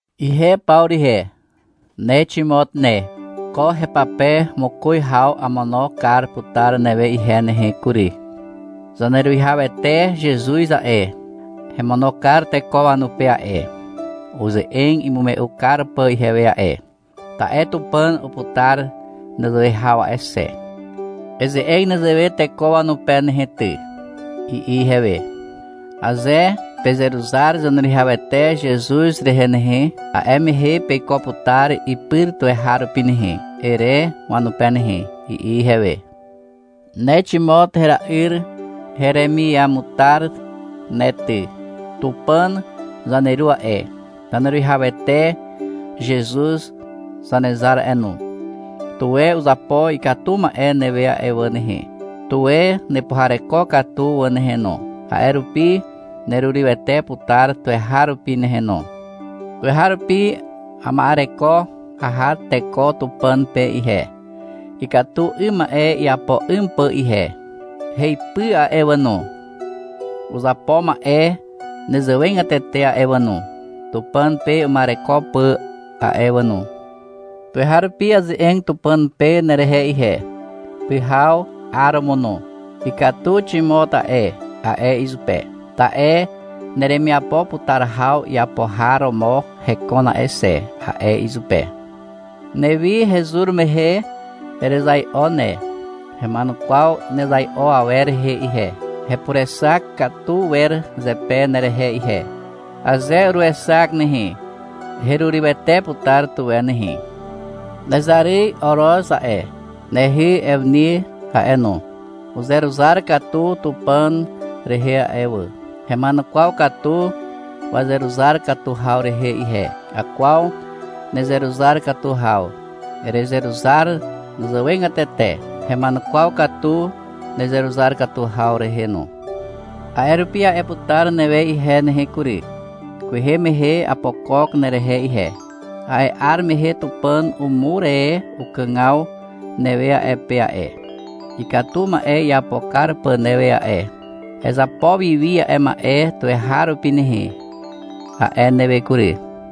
Ihe Pawru ihe, ne Ximot ne. Ko hepape mokoz haw amono kar putar newe ihe nehe kury. Zaneruwihawete Zezuz a'e, hemono kar teko wanupe a'e, uze'eg imume'u kar pà ihewe a'e. Ta'e Tupàn uputar nezewe haw a'e xe. — Eze'eg nezewe teko wanupe ne nehe ty, i'i ihewe. — Aze pezeruzar Zaneruwihawete Zezuz rehe nehe, a'e mehe peiko putar ipyr tuweharupi nehe, ere wanupe nehe, i'i ihewe. Ne Ximot hera'yr heremiamutar ne ty. Tupàn zaneru a'e, Zaneruwihawete Zezuz Zanezar a'e no, tuwe uzapo ikatu ma'e newe a'e wà nehe. Tuwe nepuhareko katu wà nehe no. A'e rupi nerurywete putar tuweharupi nehe no. Tuweharupi ama'ereko aha teko Tupàn pe ihe, ikatu 'ym ma'e iapo 'ym pà ihe. Heipy a'e wà no, uzapo ma'e nezewegatete a'e wà no, Tupàn pe uma'ereko pà a'e wà no. Tuweharupi aze'eg Tupàn pe nerehe ihe, pyhaw, 'aromo no. — Ikatu Ximot a'e, a'e izupe. — Ta'e neremiapo putar haw iapo har romo hekon a'e xe, a'e izupe. Newi hezur mehe erezai'o ne. Hema'enukwaw nezai'o awer rehe ihe. Hepurexak katu wer zepe nerehe ihe. Aze uruexak nehe, herurywete putar tuwe nehe. Nezaryz Oroz a'e, nehy Ewni a'e no, uzeruzar katu Tupàn rehe a'e wà. Hema'enukwaw katu wazeruzar katu haw rehe ihe. Akwaw nezeruzar katu haw. Erezeruzar wazàwegatete. Hema'enukwaw katu nezeruzar katu haw rehe no. A'e rupi a'e putar newe ihe nehe kury. — Kwehe mehe apokok nerehe ihe. A'e 'ar mehe Tupàn umur e ukàgaw newe a'e pe a'e, ikatu ma'e iapo kar pà newe a'e. Ezapo wiwi a'e ma'e tuweharupi nehe, a'e newe kury.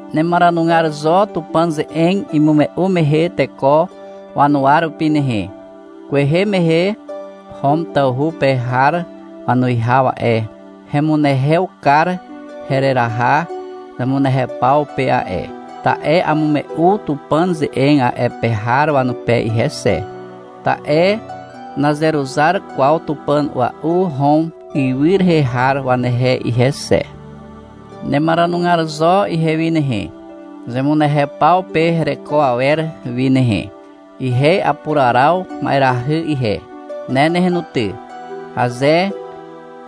Nemaranugar zo Tupàn ze'eg imume'u mehe teko wanuwa rupi nehe. Kwehe mehe Hom tawhu pe har wanuwihaw a'e, hemunehew kar hereraha zemunehew paw pe a'e, ta'e amume'u Tupàn ze'eg a'e pe har wanupe ihe xe. Ta'e nazeruzar kwaw tupàn ua'u Hom ywy rehe har wanehe ihe xe. Nemaranugar zo ihewi nehe, zemunehew paw pe hereko awer wi nehe. Ihe apuraraw ma'erahy ihe. Ne nehe no ty, aze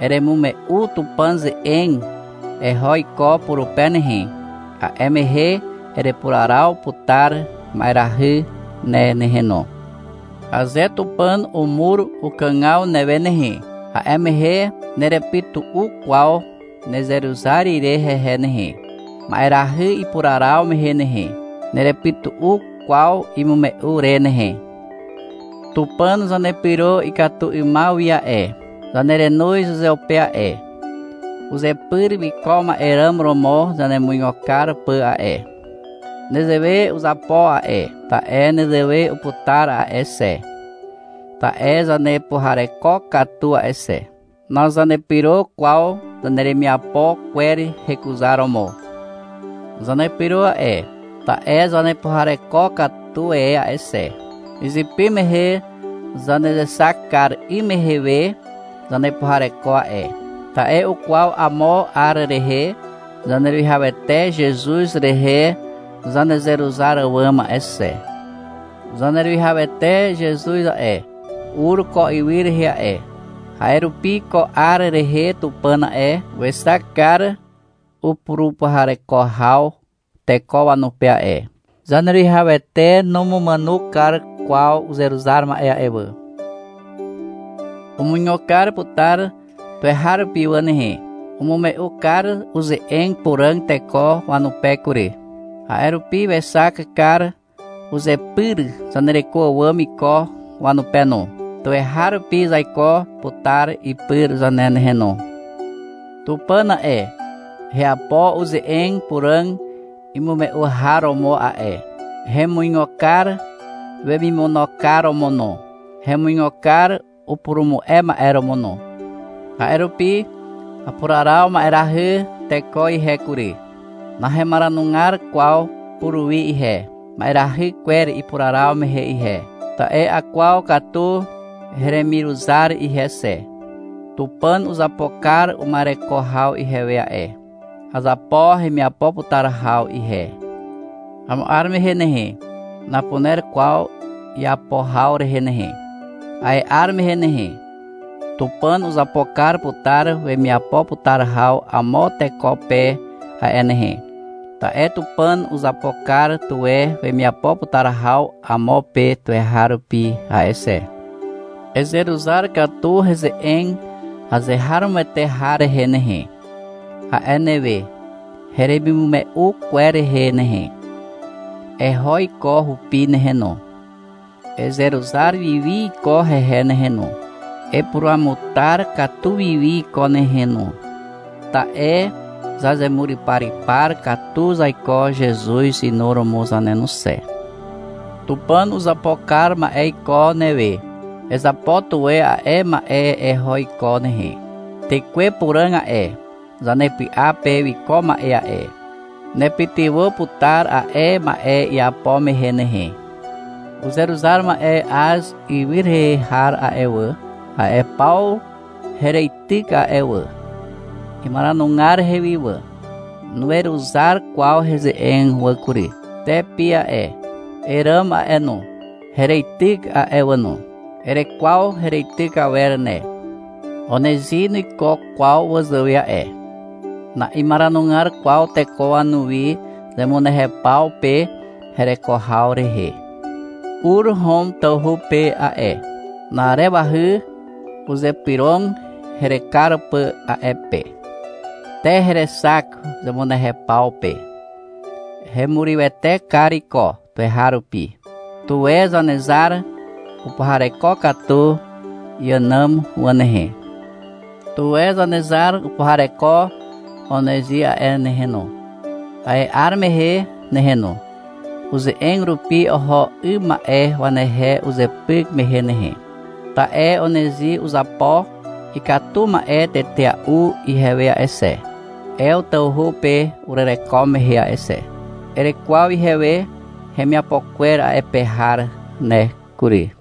eremume'u Tupàn ze'eg eho iko purupe nehe, a'e mehe erepuraraw putar ma'erahy ne nehe no. Aze Tupàn umur ukàgaw newe nehe, a'e mehe nerepytu'u kwaw nezeruzar ire hehe nehe, ma'erahy ipuraraw mehe nehe. Nerepytu'u kwaw imume'u re nehe. Tupàn zanepyro ikatu 'ymaw wi a'e, zanerenoz uzeupe a'e, uzepyr wiko ma'e ràm romo zanemuigo kar pà a'e. Nezewe uzapo a'e, ta'e nezewe uputar a'e xe, ta'e zanepuhareko katu a'e xe. Nazanepyro kwaw zaneremiapo kwer hekuzaromo. Zanepyro a'e, ta'e zanepuhareko katu e a'e xe. Izypy mehe zanezexak kar 'ym mehe we zanepuhareko a'e. Ta'e ukwaw amo 'ar rehe Zaneruwihawete Zezuz rehe zanezeruzar àwàm a'e xe. Zaneruwihawete Zezuz a'e, ur ko ywy rehe a'e. A'e rupi ko 'ar rehe Tupàn a'e, wexak kar upurupuhareko haw teko wanupe a'e. Zaneruwihawete numumàno kar kwaw uzeruzar ma'e a'e wà. Umuigo kar putar tuweharupi wà nehe. Umume'u kar uze'eg puràg teko wanupe kury. A'e rupi wexak kar uzepyr zanereko àwàm iko wanupe no. Tuweharupi zaiko putar ipyr zane nehe no. Tupàn a'e, heapo uze'eg puràg imume'u har romo a'e. Hemuigo kar wemimono kar romo no, hemuigo kar upurumu'e ma'e romo no. A'e rupi apuraraw ma'erahy teko ihe kury. Nahemaranugar kwaw puruwi ihe, ma'erahy kwer ipuraraw mehe ihe. Ta'e akwaw katu heremiruzar ihe xe. Tupàn uzapo kar uma'ereko haw ihewe a'e. Azapo hemiapo putar haw ihe. Amo 'ar mehe nehe, napuner kwaw iapo haw rehe nehe. A'e 'ar mehe nehe, Tupàn uzapo kar putar wemiapo putar haw amo teko pe a'e nehe. Ta'e Tupàn uzapo kar tuwe wemiapo putar haw amo pe tuweharupi a'e xe. Ezeruzar katu heze'eg azeharomoete har rehe nehe, a'e newe heremimume'u kwer rehe nehe. Eho iko hupi nehe no. Ezeruzar wiwi iko hehe nehe no, epuruamutar katu wiwi iko nehe no. Ta'e zazemuryparypar katu zaiko Zezuz inuromo zane no xe. Tupàn uzapo kar ma'e iko newe. Ezapo tuwe a'e ma'e eho iko nehe. Tekwe Puràg a'e, zanepy'a pe wiko ma'e a'e, nepytywà putar a'e ma'e iapo mehe nehe. Uzeruzar ma'e Az ywy rehe har a'e wà, a'e paw hereityk a'e wà. Imaranugar hewi wà. Nuweruzar kwaw heze'eg wà kury. Te Pi a'e, Eràmo a'e no, hereityk a'e wà no. Erekwaw hereityk awer ne. Onezi nuiko kwaw wazàwe a'e. Na'imaranugar kwaw teko wanuwi zemunehew paw pe hereko haw rehe. Ur Hom tawhu pe a'e. Na'arewahy uzypyrog herekar pà a'e pe. Te herexak zemunehew paw pe. Hemurywete kar iko tuweharupi. Tuwe Zanezar upuhareko katu iànàm wà nehe. Tuwe Zanezar upuhareko Onezi a'e nehe no, a'e 'ar mehe nehe no, uze'eg rupi oho 'ym ma'e wanehe uzepyk mehe nehe. Ta'e Onezi uzapo ikatu ma'e tetea'u ihewe a'e xe, Ew tawhu pe urereko mehe a'e xe. Erekwaw ihewe hemiapo kwer a'e pe har ne kury.